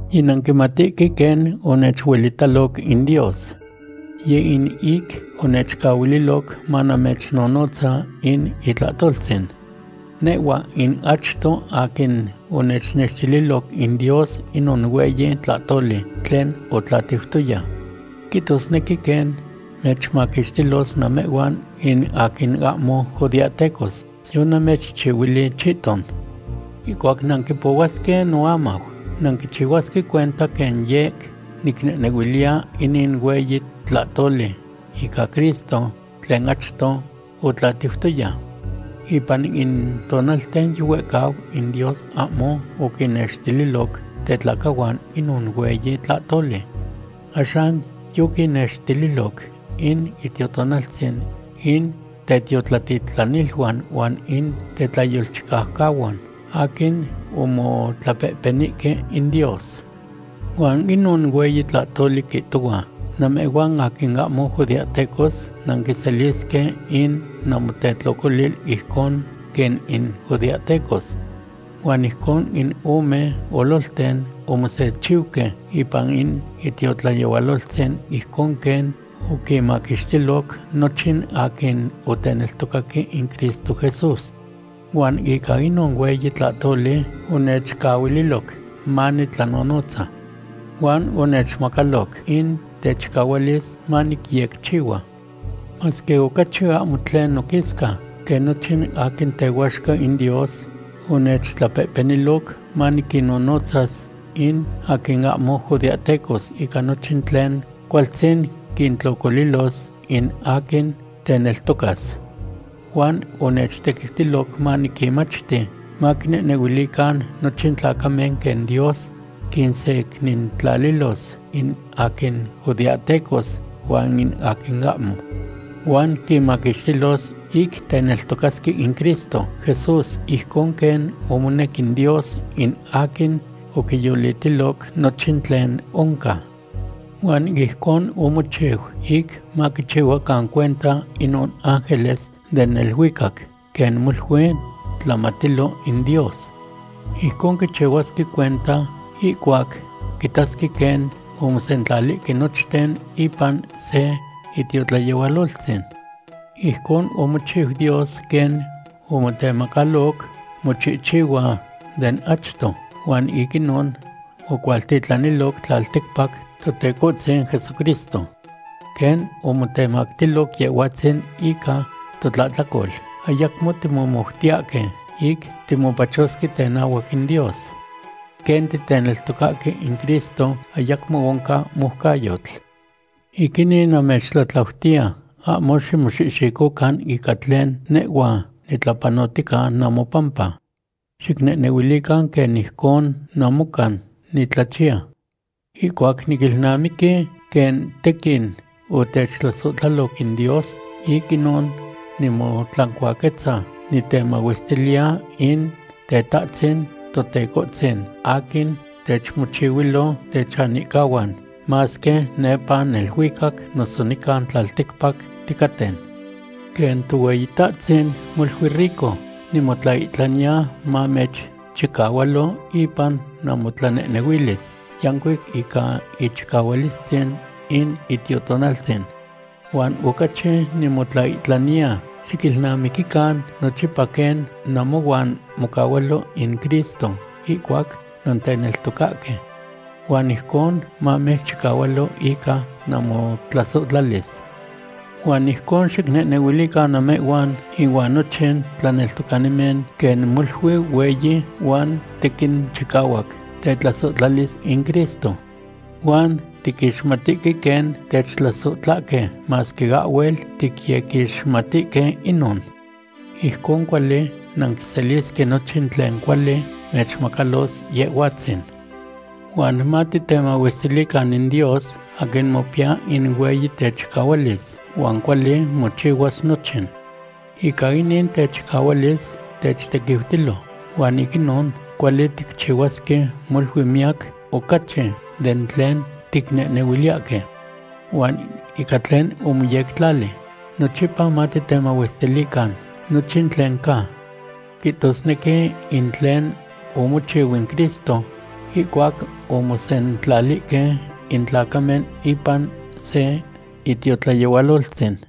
Yinanquimatihque quen onechuelitaloc in Dios. Yeh in ic onechcahuililoc manamechnonotza in itlahtoltzin. Nehhua in achto aquin onechnextililoc in Dios inon hueyi tlahtoli tlen otlatiutoya. Quihtosnequi quen mechmaquixtilos namehhuan in aquin ahmo judeahtecos, yonamechihcuilui chihton. Ihcuac nanquipohuasque noamau, nanquichihuasque cuenta quen yec nicnehnehuiliya inin hueyi tlahtoli ica Cristo tlen achto otlatiutoya. Ipan in tonalten yihuehcau in Dios ahmo oquinnextililoc tetlacahuan inon hueyi tlahtoli. Axan yoquinextililoc in Itiotonaltzin in tetiotlatitlaniluan huan in tetlayolchicaucahuan, aquin omotlapehpenihque in Dios. Huan inon hueyi tlahtoli quihtohua namehhuan aquin ahmo judeahtecos nanquiselisque in namotetlocolil ijcon quen in judeahtecos. Huan ijcon in ome ololten omosechiuque ipan in itiotlayehualoltzin ijcon quen oquinmaquixtiloc nochin aquin oteneltocaque in Cristo Jesús. Huan ica inon hueyi tlahtoli onechcahuililoc manitlanonotza. Huan onechmacaloc in techicahualis manicyecchihua. Masque ocachi ahmo tlen noquisca quen nochin aquin tehuaxca in Dios, onechtlapehpeniloc maniquinnonotzas in aquin ahmo judeahtecos ica nochin tlen cualtzin quintlocolilos in aquin teneltocas. Huan onechtequiutiloc maniquinmachti maquinehnehuilican nochin tlacamen quen Dios quinsecnintlalilos in aquin judeahtecos huan in aquin ahmo. Huan quinmaquixtilos ic teneltocasque in Cristo Jesús ijcon quen omonec in Dios in aquin oquiyolitiloc nochin tlen oncan. Huan ijcon omochiu, ic maquichihuacan cuenta inon ángeles den neluicac quen molui tlamatilo in Dios. Ijcon quichihuasque cuenta ihcuac quitasque quen omosentlalihque nochten ipan se itiotlayehualoltzin. Ijcon omochiu Dios quen omotemacaloc mochihchihua den achto, huan ic inon ocualtitlaniloc tlalticpac Totecohtzin Jesucristo. Quen omotemactilo Yehhuatzin ica totlahtlacol, ayacmo timomoutiyahque ic timopachosque tenahuac in Dios. Quen titeneltocahque in Cristo, ayacmo oncan moucayotl. Ic inin, namechtlatlautiya ahmo ximoxihxicocan ica tlen nehhua nitlapanohtica namopampa. Xicnehnehuilican quen ijcon namocan nitlachiya. Ihcuac niquilnamiqui quen tequin otechtlasohtlaloc in Dios, ic inon nimotlancuaquetza nitemahuestiliya in Tetahtzin Totecohtzin aquin techmochihuilo techanihcahuan, masque nepa neluicac noso nican tlalticpac ticaten. Quen Tohueyitahtzin molui rico nimotlaihtlaniya mamechchicahualo ipan namotlanehnehuilis yancuic ica ichicahualistzin in Itiotonaltzin. Huan ocachi nimotlaihtlaniya xquilnamiquican nochipa quen namohuan mocahualo in Cristo ihcuac nanteneltocahque. Huan ijcon mamechchicahualo ica namotlasohtlalis. Huan ijcon xicnehnehuilican namehhuan inuan nochin tlaneltocanimen quen molui hueyi huan tequin chicahuac tetlasohtlalis in Cristo. Huan tiquixmatihque quen techtlasohtlahque masque ahhuel ticyequixmatihque inon. Ijcon cuali nanquiselisque nochin tlen cuali mechmacalos Yehhuatzin. Huan matitemahuestilican in Dios aquin mopiya in hueyi techicahualis huan cuali mochihua nochin. Ica inin techicahualis techtequiutilo, huan ic inon cuali ticchihuasque molui miyac ocachi den tlen ticnehnehuiliyahque. Huan ica tlen omoyectlali, nochipa matemahuestilican nochin tlen ca. Quihtosnequi in tlen omochiu in Cristo, ihcuac omosentlalihque in tlacamen ipan se itiotlayehualoltzin.